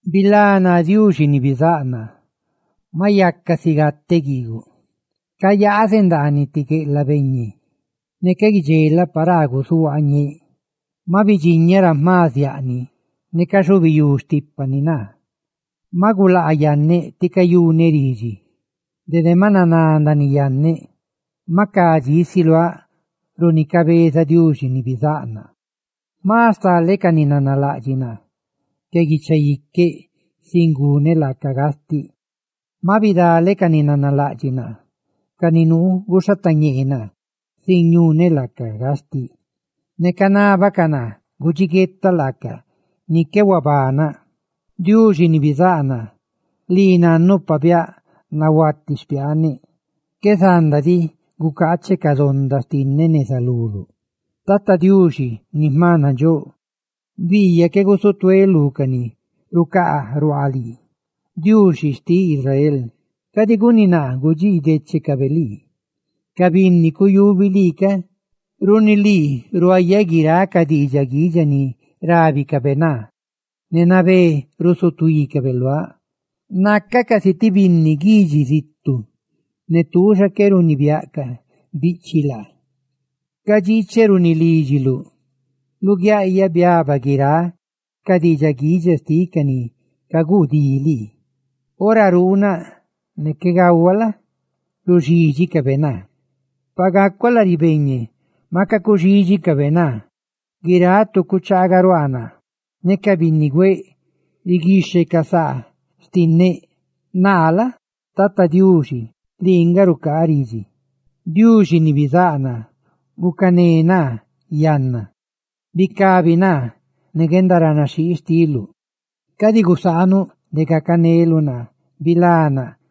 Bilá naa, Diuxi ni bizáꞌ naa, maꞌ yaca si gateꞌ guiiguꞌ; cayaazeꞌ ndaaniꞌ ti gueꞌlaꞌ beñe, ne qué guidxelaꞌ paraa guzuhuaañeeꞌ. Maꞌ bidxiñaꞌ ra jma ziaꞌni ne caxubiyú xtípani naa. Maꞌ gulaa yanneꞌ ti cayuneꞌ ridxi; dede maꞌ naná ndaaniꞌ yanneꞌ; ¡maꞌ ca dxí si luáꞌ runi cabezaꞌ Diuxi ni bizáꞌ naa! Jma stale ca ni nanalaꞌdxiꞌ naa sin guneꞌ laaca gastiꞌ que ca guicha iqueꞌ; maꞌ bidale ca ni nanalaꞌdxiꞌ naa, ca ni nuu guxhatañee naa sin ñuneꞌ laaca gastiꞌ, ne canábacaꞌ naa gudxiguetaꞌ laaca ni qué huabanaꞌ. Diuxi ni bizáꞌ naa, lii nannuꞌ pabiáꞌ nahuati xpiaaneꞌ; qué zanda diꞌ gucaacheꞌ ca donda xtinneꞌ neza luluꞌ. Tata Diuxi, Diuxi ni jma nandxóꞌ, ¡biiyaꞌ qué gusutuéꞌ lú ca ni rucaa ruaa lii! Diuxi xtiꞌ Israel, ¡cadi guni naa gudxiidechecabe lii, ca binni cuyubi lii ca! Runi lii ruayaꞌ guiráꞌ ca diidxaꞌ guidxa ni rábicabe naa; ne nabé rusutuícabe luáꞌ; ¡nacaꞌ casi ti binni guidxi zitu ne tuuxa qué runibiáꞌ ca biꞌchiꞌ laa! Cadxiicheꞌ runi lídxiluꞌ; luguiaꞌyaꞌ biaba guiráꞌ ca diidxaꞌ guidxa xtiꞌ ca ni caguu dí lii. Ora ruunaꞌ ne qué gahuaꞌ la? ruxídxicabe naa; pa gacuáꞌ lari yaaseꞌ, maca cuxídxicabe naa. Guiráꞌ tu cuchagaruaa naa, ne ca binnigüeꞌ riguixhecaꞌ saa xtinneꞌ. Naa la? Tata Diuxi, lii nga rucaa ridxi. Diuxi ni bizáꞌ naa, ¡gucané naa yanna! Runi guendaranaxhii xtiluꞌ, ¡bicabi naa! Cadi gusaanuꞌ de gacaneluꞌ naa, ¡bilá naa!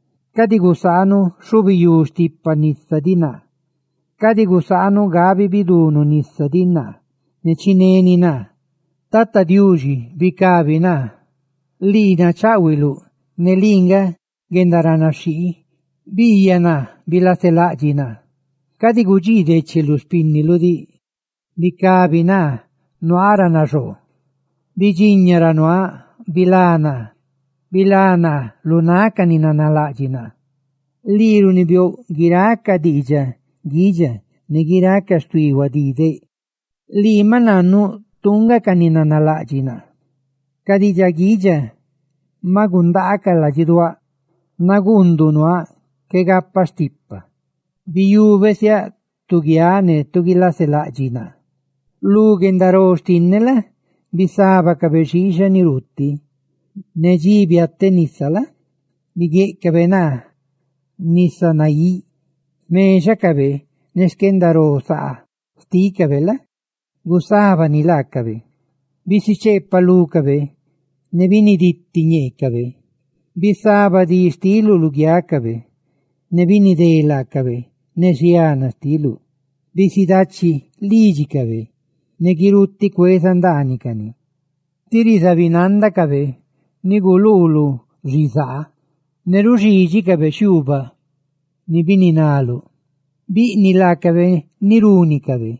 ¡Cadi gusaanuꞌ xhubiyú stipa nisa diꞌ naa! ¡Cadi gusaanuꞌ gabi bidunu nisa diꞌ naa ne chineni naa! Tata Diuxi, bicabi naa; ¡lii nacháꞌhuiluꞌ ne lii nga guendaranaxhii! Biiyaꞌ naa, bilaselaꞌdxiꞌ naa; ¡cadi gudxiidecheluꞌ xpínniluꞌ diꞌ! ¡Bicabi ca naa, nuaa ra naxoo! Bidxiña ra nuaaꞌ, ne bilá naa; ¡bilá naa lu náꞌ ca ni nanalaꞌdxiꞌ naa! Lii runibiouꞌ guiráꞌ ca diidxaꞌ guidxa, ne guiráꞌ ca xtuí huadideꞌ; lii maꞌ nannuꞌ tuu nga ca ni nanalaꞌdxiꞌ naa. Ca diidxaꞌ guidxa ca maꞌ gundaacaꞌ ladxiduáꞌ; ¡naguunduꞌ nuaaꞌ qué gapaꞌ stipa! Biyubeꞌ siáꞌ tu laa guiáꞌ ne guilaselaꞌdxiꞌ naa. Lu guendaró xtinneꞌ la? bisábacabe xiixa ni ruuti, ne dxi guteꞌ nisa la? biguéꞌcabe naa nisa naíꞌ. ¡Xmexacabe ne guendaró rutaagulisaa laacabe la? gusábani laacabe! ¡Bisicheepaꞌ lúcabe ne biniditi ñeecabe! Bisaba dí xtiluꞌ luguiácabe; ¡ne binidé laacabe ne xiana xtiluꞌ! Bisidachi lídxicabe, ne guirutiꞌ cueza ndaanicani; tí rizabinandacabe ni guluuluꞌ xizaa ne ruxídxicabe xiuubaꞌ ni bininaluꞌ. Biquixe laacabe ni runicabe;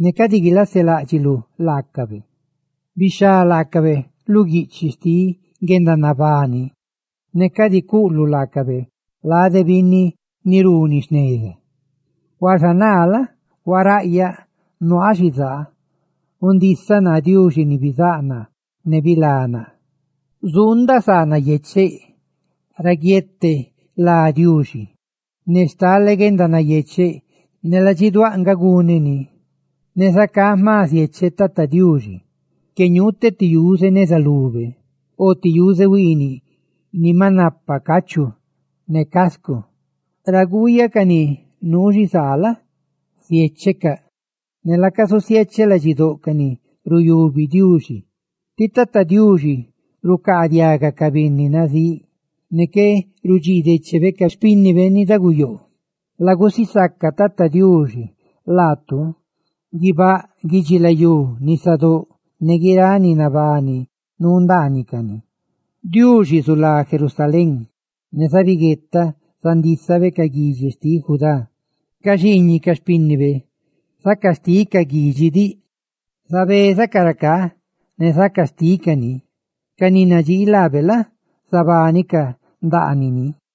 ¡ne cadi guilaseláꞌdxiluꞌ laacabe! ¡Bixhá lácabe lu guiꞌchiꞌ xtiꞌ guendanabani! ¡Ne cadi cuꞌluꞌ laacabe lade binni ni runi jneza! Huaxa naa la? huaraꞌyaꞌ ne nuaaꞌ xizaa, gundisa naa, Diuxi ni bizáꞌ naa, ne bilá naa. Zuundaꞌ saa nayecheꞌ ra guiete lá Diuxi; ne stale guendanayecheꞌ ne ladxiduáꞌ nga guneꞌ ni, ne zacá jma ziecheꞌ Tata Diuxi que ñuuteꞌ ti yuze neza lube o ti yuze huiiniꞌ ni maꞌ napa cachu ne cascu. Ra guꞌyaꞌ ca ni nuu xizaa la? ziéchecaꞌ ne laca zusiecheꞌ ladxidóꞌ ca ni ruyubi Diuxi; ti Tata Diuxi rucaadiaga ca binni nazíꞌ ne qué rudxii déchebe ca xpínnibe ni daguyoo. ¡Lagusisaca Tata Diuxi laatu, guibáꞌ, guidxilayú, nisadóꞌ ne guiráꞌ ni nabani nuu ndaanicani! Diuxi zulá Sión, ne zabiguetaꞌ zandísabe ca guidxi xtiꞌ Judá. Ca xiiñiꞌ ca xpínnibe zaca xticaꞌ guidxi diꞌ, zabezacaꞌ racá ne zaca xticaꞌ ni; ¡ca ni nadxii laabe la? zabánicaꞌ ndaanini!